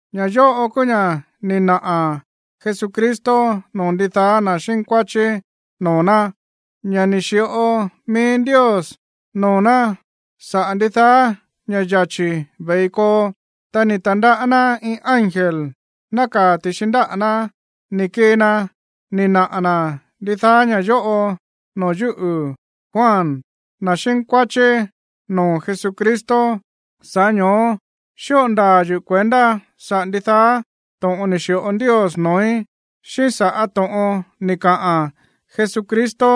Ña̱ yóꞌo kúú ña̱ ni̱ naꞌa̱ Jesucristo noo̱ ndidaá na̱ xínkuáchí noo̱ ná, ña̱ ni̱ xi̱ꞌo mií Ndios noo̱ ná saꞌa̱ ndidaá ña̱ꞌa yachi̱ ve̱i koo. Ta ni̱ ta̱ndaꞌá ná iin ángel nákaa̱ ti̱xi ndáꞌa̱ ná, ni̱ kii na ni̱ naꞌa̱ na̱ ndidaá ña̱ yóꞌo noo̱ yúꞌu̱, Juan, na̱ xínkuáchí noo̱ Jesucristo. Sa̱ꞌá ño̱ó xíꞌo ndaa̱ yuꞌu̱ kuendá saꞌa̱ ndidaá to̱ꞌon ni̱ xi̱ꞌo Ndios noo̱í, xíꞌín saꞌa̱ to̱ꞌon ni̱ kaꞌa̱n Jesucristo,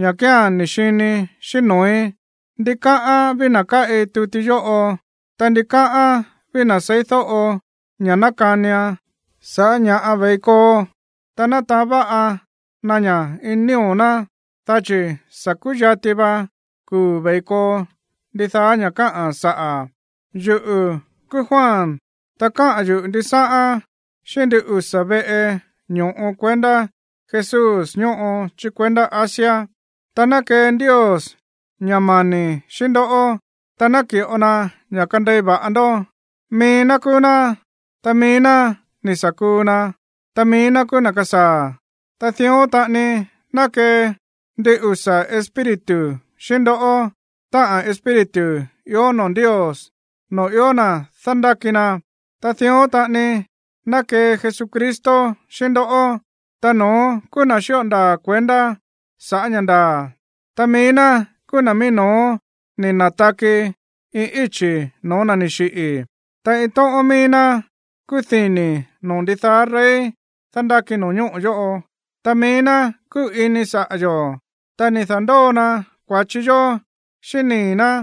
ña̱ kía̱n ni̱ xinii̱ xíꞌín noo̱í. Ndikáꞌán ví na̱ káꞌi tuti yóꞌo, ta ndikáꞌán ví na̱ seídóꞌo ña̱ nákanian sa̱ꞌá ña̱ ve̱i koo, ta nátaán váꞌa na ña̱ ini nío̱ ná, dá chi̱ sa̱ kúyati va kuu̱ ve̱i koo ndidaá ña̱ káꞌa̱n saꞌa̱. Yuꞌu̱ kúú Juan, ta káꞌa̱n yuꞌu̱ ndisáꞌán xíꞌín ndin usa̱ veꞌe ño̱ꞌo kuendá Jesús ñóꞌo chí kuendá Asia. Ta ná kee Ndios ña̱ mani̱ xíꞌín ndoꞌó, ta ná ki̱ꞌo na ña̱ kandei va̱ꞌa ndó. Mií ná kúú ná, ta mií ná ni̱ sa̱ kuu na, ta mií ná kúú na̱ kasaa̱. Ta dión taꞌani ná kee ndin usa̱ espíritu xíꞌín ndoꞌó, táꞌa̱n espíritu ió noo̱ Ndios, noo̱ ió na̱ dándáki na. Ta dión taꞌani ná kee Jesucristo xíꞌín ndoꞌó. Ta no̱ón kúú na̱ xíꞌo ndaa̱ kuendá sa̱ꞌá ña̱ ndaa̱, ta mií ná kúú na̱ mií no̱ó ni̱ na̱taki iin íchi̱ no̱ó na̱ ni̱ xiꞌi̱, ta iin tóꞌón mií ná kúú dini̱ noo̱ ndidaá rey dándáki no̱ñóꞌo̱ yóꞌo. Ta mií ná kúꞌu̱ ini saꞌa̱ yo̱, ta ni̱ da̱ndóo na kua̱chi yó xíꞌín nii̱ ná,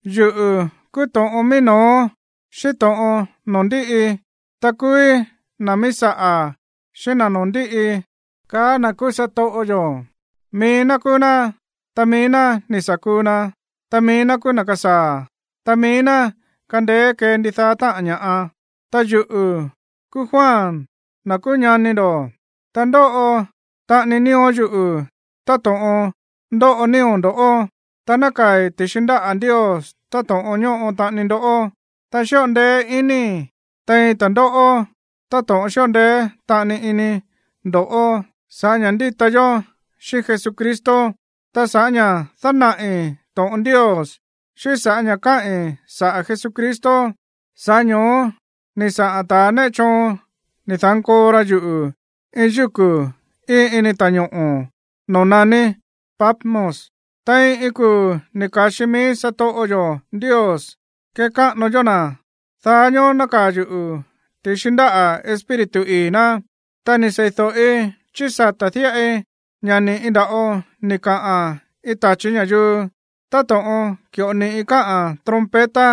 “Yuꞌu̱ kúú to̱ꞌon mií no̱ó xíꞌín to̱ꞌon noo̱ ndíꞌi, ta kúúí na̱ míí saꞌa̱ xíꞌín na̱ noo̱ ndíꞌi”, kaá na̱ kúú satoꞌo yo̱. Mií ná kúú ná, ta mií ná ni̱ sa̱ kuu na, ta mií ná kúú na̱ kasaa̱, ta mií ná kándéé kée ndidaá táꞌa̱n ña̱ꞌa. Ta yuꞌu̱ kúú Juan, na̱ kúú ñani ndo̱, ta ndóꞌo taꞌani nío̱ yuꞌu̱ táto̱ꞌon ndóꞌo nío̱ ndo̱ꞌó, ta nákaa̱i̱ ti̱xi ndáꞌa̱ Ndios táto̱ꞌon ñóꞌo taꞌani ndoꞌó, ta xíꞌo ndeé inii̱ tein ta̱ndóꞌó táto̱ꞌon xíꞌo ndeé taꞌani ini ndo̱ꞌó sa̱ꞌá ña̱ ndíta yó xíꞌín Jesucristo. Ta sa̱ꞌá ña̱ dánaꞌi̱ to̱ꞌon Ndios, xíꞌín sa̱ꞌá ña̱ káꞌi̱n saꞌa̱ Jesucristo, sa̱ꞌá ño̱ó ni̱ saꞌa̱n ta̱ néꞌe choon ni̱ da̱nkoo ra yuꞌu̱ iin yúku̱ íin ini ta̱ñoꞌo̱ noo̱ naní Patmos. Tein iin kuu̱ ni̱ ka̱xi mií satoꞌo yo̱ Ndios kekáꞌano yó na̱, daá ñoó nákaa̱ yuꞌu̱ ti̱xi ndáꞌa̱ Espíritu ii̱ ná. Ta kúú ni̱ seídóꞌi chí sata̱ díꞌai ña̱ ni̱ꞌi nda̱ꞌo ni̱ kaꞌa̱n iin tachi̱ ña̱yuu. Táto̱ꞌon ki̱ꞌo ni̱ꞌi káꞌa̱n trompeta,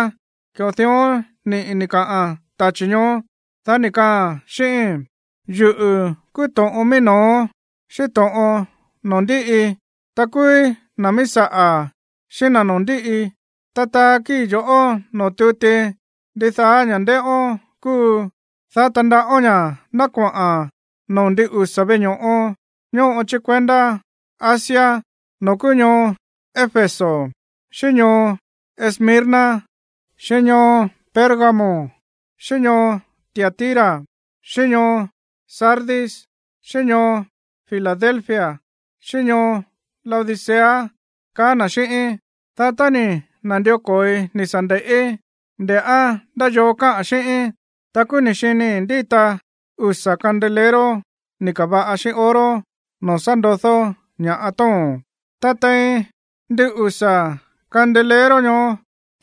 ki̱ꞌo dión ni̱ꞌi ni̱ kaꞌa̱n tachi̱ ñoó. Dá ni̱ kaꞌa̱n xíꞌíín: ―Yuꞌu̱ kúú to̱ꞌon mií no̱ó xíꞌín to̱ꞌon noo̱ ndíꞌi, ta kúúí na̱ míí saꞌa̱ xíꞌín na̱ noo̱ ndíꞌi. Ta taa kíi̱ yo̱ꞌó noo̱ tuti ndidaá ña̱ ndéꞌón kúu, dá tandaꞌón ña̱ ná koꞌa̱n noo̱ ndin usa̱ veꞌe ño̱ꞌo ñóꞌo chí kuendá Asia, noo̱ kúú ñoo Éfeso, xíꞌín ñoo Esmirna, xíꞌín ñoo Pérgamo, xíꞌín ñoo Tiatira, xíꞌín ñoo Sardis, xíꞌín ñoo Filadelfia xíꞌín ñoo Laodicea ―kaá na̱ xíꞌíín. Dá tá ni̱ na̱ndió ko̱oi ni̱ sa̱ nde̱ꞌí, nde̱ꞌá ndá yoo káꞌa̱n xíꞌíín, ta kúú ni̱ xinii̱ ndíta usa̱ candelero ni̱ ka̱va̱ꞌa xíꞌín oro, noo̱ sá ndodó ña̱ tóo̱n. Ta tein ndin usa̱ candelero ñoó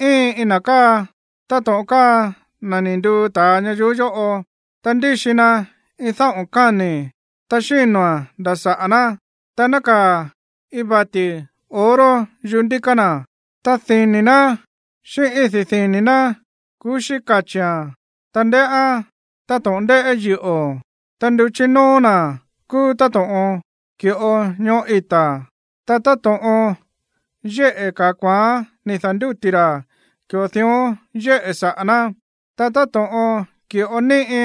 íin iin na̱ káa táto̱ꞌon káa na̱ ni̱ nduu ta̱a ñayuú yóꞌo. Ta ndíxi na iin dáꞌo̱n káni̱, ta xíno̱a̱n nda̱ saꞌa̱ ná, ta nákaa̱ iin vati̱ oro yuꞌú ndíká na̱. Ta dini̱ ná xíꞌín idí dini̱ ná kuxí kachi̱a̱n, ta ndéꞌán táto̱ꞌon ndéꞌé yiꞌo̱, ta nduchí nóó na̱ kúú táto̱ꞌon ki̱ꞌo ñoꞌó ita̱. Ta táto̱ꞌon yéꞌe̱ ka̱a kuaán ni̱ da̱ndúti̱ ra̱, ki̱ꞌo dión yéꞌe̱ saꞌa̱ ná. Ta táto̱ꞌon ki̱ꞌo níꞌi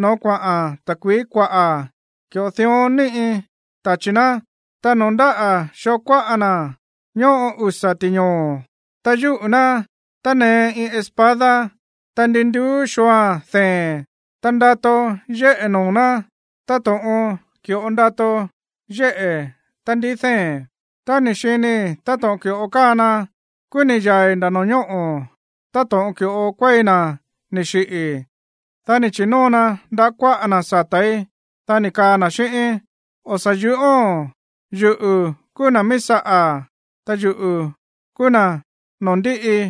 no̱ó kuaꞌa̱n ta̱kui̱í kuaꞌa̱, ki̱ꞌo dión níꞌi tachi̱ ná. Ta noo̱ ndáꞌa̱ xoo kuáꞌa na̱ ñóꞌo usa̱ ti̱ñoo̱, ta yúꞌu̱ ná tánee iin espada, ta ndi nduú xooa̱n dee̱n. Ta ndato yéꞌe̱ noo̱ ná táto̱ꞌon ki̱ꞌo ndato yéꞌe̱ tá ndií dee̱n. Tá ni̱ xinii̱ táto̱ꞌon ki̱ꞌo káa na, kúú ni̱ yaa̱i̱ nda̱ no̱ñóꞌo̱ táto̱ꞌon ki̱ꞌo kuéi na̱ ni̱ xiꞌi̱. Dá ni̱ chi̱nóo na ndaꞌá kuáꞌa na̱ sata̱í, dá ni̱ kaa na̱ xíꞌíín: ―O̱ sa̱ yúꞌóo̱n. Yuꞌu̱ kúú na̱ míí saꞌa̱, ta yuꞌu̱ kúú na̱ noo̱ ndíꞌi.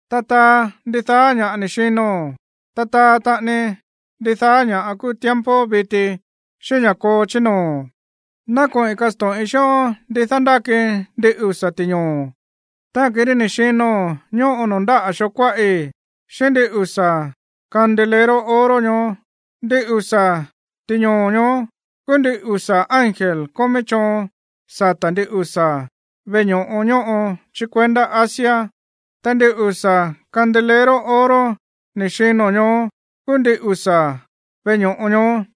Ta taa ndidaá ña̱ ni̱ xino̱n, ta taa taꞌani ndidaá ña̱ kúu tiempo viti, xíꞌín ña̱ koo chí noo̱. Ná koꞌi̱n kasto̱ꞌin xíꞌón ndi dándáki ndin usa̱ ti̱ñoo̱, táꞌa̱n kirí ni̱ xino̱n ñóꞌo noo̱ ndáꞌa̱ xoo kuáꞌi̱, xíꞌín ndin usa̱ candelero oro ñoó. Ndin usa̱ ti̱ñoo̱ ñoó kúú ndin usa̱ ángel kómí choon sata̱ ndin usa̱ veꞌe ño̱ꞌo ñóꞌo chí kuendá Asia, ta ndin usa̱ candelero oro ni̱ xino̱n ñoó kúú ndin usa̱ veꞌe ño̱ꞌo ñoó.